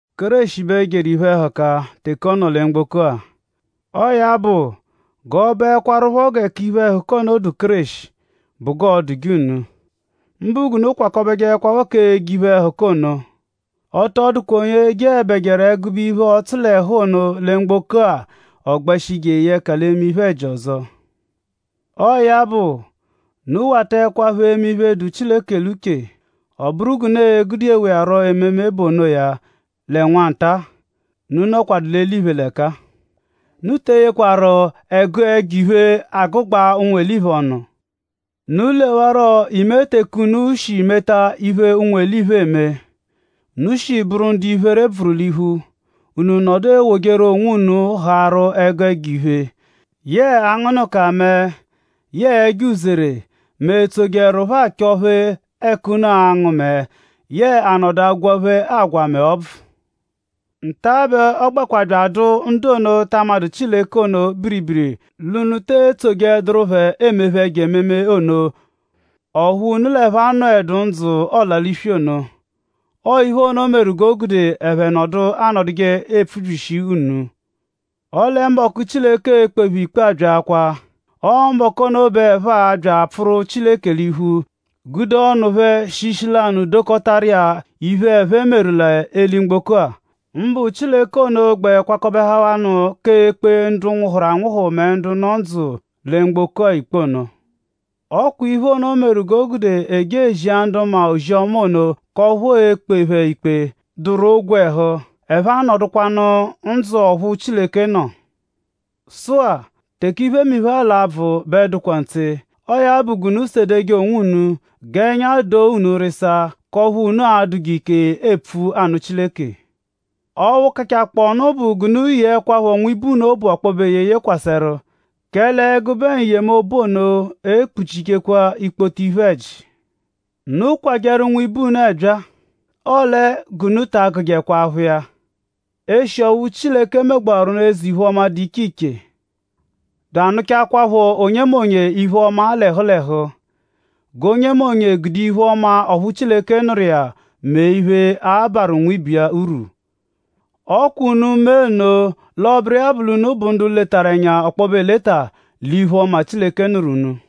Kéreshi bẹ jeru iphe-ẹhuka teke ọ nọ lẹ mgboko-a. Ọo ya bụ; g'ọ bụekwarupho gẹ k'iphe-ẹhuka ono dụ Kéreshi bụ g'ọo-dụje unu; mbụ g'unu kwakọbekwa k'eje ẹgube iphe-ẹhuka ono. Ọ tọ dụkwa onye jeẹbejeru ẹgube iphe-ọtsu-l'ẹhu ono lẹ mgboko-a ọ gbẹshi jeye ẹka l'eme iphe-ẹji ọzo. Ọo ya bụ; unu wataẹkwapho eme iphe dụ Chileke l'uche. Ọ bụru g'unu e-gudewa iya rọ ememe bụ onoya lẹ nwa nta-a, unu nọkwadu l'eliphe l'ẹka-a. Unu te eyeẹkwaru ẹgu ẹjo-iphe agụgbabe ụnwu-eliphe ọnu. Unu lewarọ ime teke unu shi meta iphe, ụnwu-eliphe eme. Unu shi bụru ndu iphere bvụru l'iphu; unu nọdu ewojeru onwunu haarụ ẹgu ẹjo-iphe; yẹe angụnuka mẹe yẹe ẹjo-uzere; mẹ etsojeẹrupho achọ-phe ẹka unu angụ mẹe; yẹe anọdu agwaphe agwa mẹ ọbvu. Nta-a bẹ ọ gbẹkwa bya adụ ndu ono, ta amadụ Chileke ono biribiri l'unu te etsojeẹduru phẹ emephe ẹjo ememe ono; ọphu unu l'ẹphe anọedu ndzụ ọla-l'iswi ono. Ọo iphe ono meru g'o gude ẹphe nọdu anọduje epfubyishi unu. Ọle mbọku, Chileke e-kpe phẹ ikpe abyaakwaa. Ọo mbọku ono bẹ ẹphe a-bya apfụru Chileke l'iphu; gude ọnu phẹ shi ishi lanụ dokọtaru iya iphe, ẹphe meru l'eli-mgboko-a; mbụ Chileke ono gbẹ kwakọbehawanu k'ekpe ndu nwụhuru anwụhu mẹ ndu nọ ndzụ lẹ mgboko-a ikpe ono. Ọ kwa iphe ono meru g'o gude e je ezia ndu maa ozi-ọma ono k'ọphu e-kpe phẹ ikpe, dụru ogwẹhu; ẹphe anọdukwanu ndzụ ọphu Chileke nọ. Sụ-a; teke iphemiphe-a l'abvụ bẹ dụkwaa ntse. Ọo ya bụ g'unu sedeje onwunu; g'ẹnya doo unu rịsaa; k'ọphu unu a-dụje ike epfu anụ Chileke. Ọphu kachakpọo nụ bụ g'unu yeẹkwapho nwibe unu obu ọkpobe eyeye kwasẹru; kẹle ẹgube n-yemobu ono ekpuchijekwa ikpoto iphe-ẹji. Unu kwajẹru nwibe unu ẹbyaa. Ọle g'unu ta agụjekwa aphụ iya. Eshi ọphu Chileke megbawaru unu eze-iphe-ọma, dụ iche iche; bya anụchakwaapho onyemonye iphe-ọma l'ẹhu l'ẹhu; g'onyemonye gude iphe-ọma ọphu Chileke nụru iya mee iphe, a-barụ nwibe iya urwu. Ọ kwa unu mee nno l'ọ bụru iya bụ l'unu bụ ndu letaru ẹnya ọkpobe eleta l'iphe-ọma, Chileke nụru unu.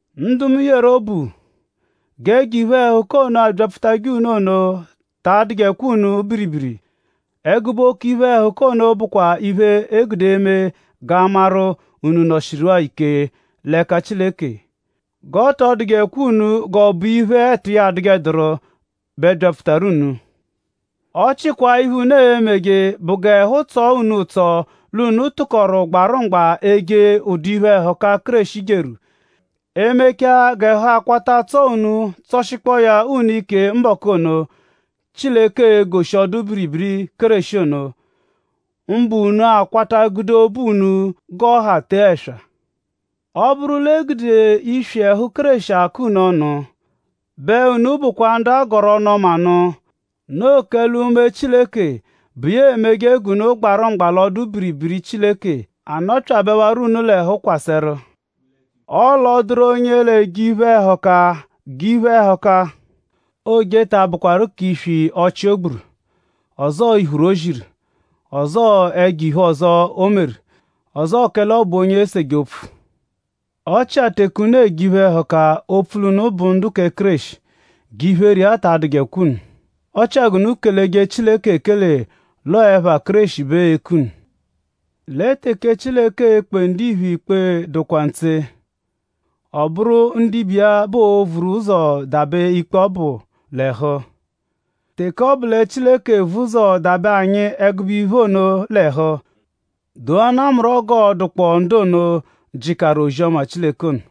Ndu mu yeru obu; g'ẹjo iphe-ẹhuka ono, abyapfutajẹ unu ono ta adụjekwa unu biribiri. Ẹgube oke iphe-ẹhuka ono bụkwa iphe, e gude eme g'a maru?unu nọshiru-a ike l'ẹka Chileke. G'ọ tọ dụjekwa unu g'ọ bụ iphe, ẹtu iya adụjeduru bẹ byapfutaru unu. Ọ chikwaa iphe, unu e-meje bụ g'ẹhu tsọje unu ụtso l'unu tụkoru gbarụ mgba eje ụdu iphe-ẹhuka, Kéreshi jeru; e -mechaa g'ẹhu akwata tsọo unu tsọshikpoo ya unu ike mbọku ono, Chileke e-goshi ọdu-biribiri Kéreshi ono; mbụ unu a-kwata gude obu unu g'ọ ha tee ẹswa. Ọ -bụru l'egude iswi ẹhu Kéreshi akọ unu ọnu; bẹ unu bụkwaa ndu a gọru ọnu-ọma nụ; noo kẹle Unme Chileke, bụ iya emeje g'unu gbarụ mgba l'ọdu-biribiri Chileke anọpyabewaro unu l'ẹhu kwasẹru. Ọle ọ -dụru onye l'eje iphe-ẹhuka; g'iphe-ẹhuka, ooje ta abụkwaru k'iswi ọchi, o gburu; ọzoo iphuru o ziru; ọzoo ẹjo-iphe ọzo, o meru; ọzoo kẹle ọ bụ onye eseje opfu. Ọ chia teke unu eje iphe-ẹhuka opfu l'unu bụ ndu kẹ Kéreshi; g'iphere iya ta adụkwa unu; ọ chia g'unu keleje Chileke ekele l'ọo ẹpha Kéreshi bẹ eeku unu. Lẹ teke Chileke e-kpe ndiphe ikpe dụkwaa ntse. Ọ bụru ndibe iya bẹ oo-vuru ụzo dabẹ ikpe ọbu l'ẹhu. Teke ọ bụ lẹ Chileke vu ụzo dabẹ anyi ẹgube iphe ono l'ẹhu; doanaa mu rọ g'ọo-dụkpoo ndu ono, jịkaru ozi-ọma Chileke ono.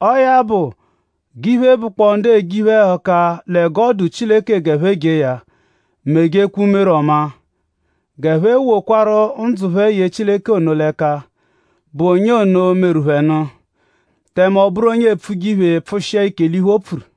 Ọo ya bụ; g'iphe, bụkpoo ndu eje iphe-ẹhuka lẹ g'ọ dụ Chileke g'ẹphe jee ya; mejekwa umere ọmaa. G'ẹphe wokwaru ndzụ phẹ ye Chileke ono l'ẹka, bụ onye ono, meru phẹ nụ; tẹme ọ bụru onye epfuje iphe; pfụshia ike l'iphe, o pfuru.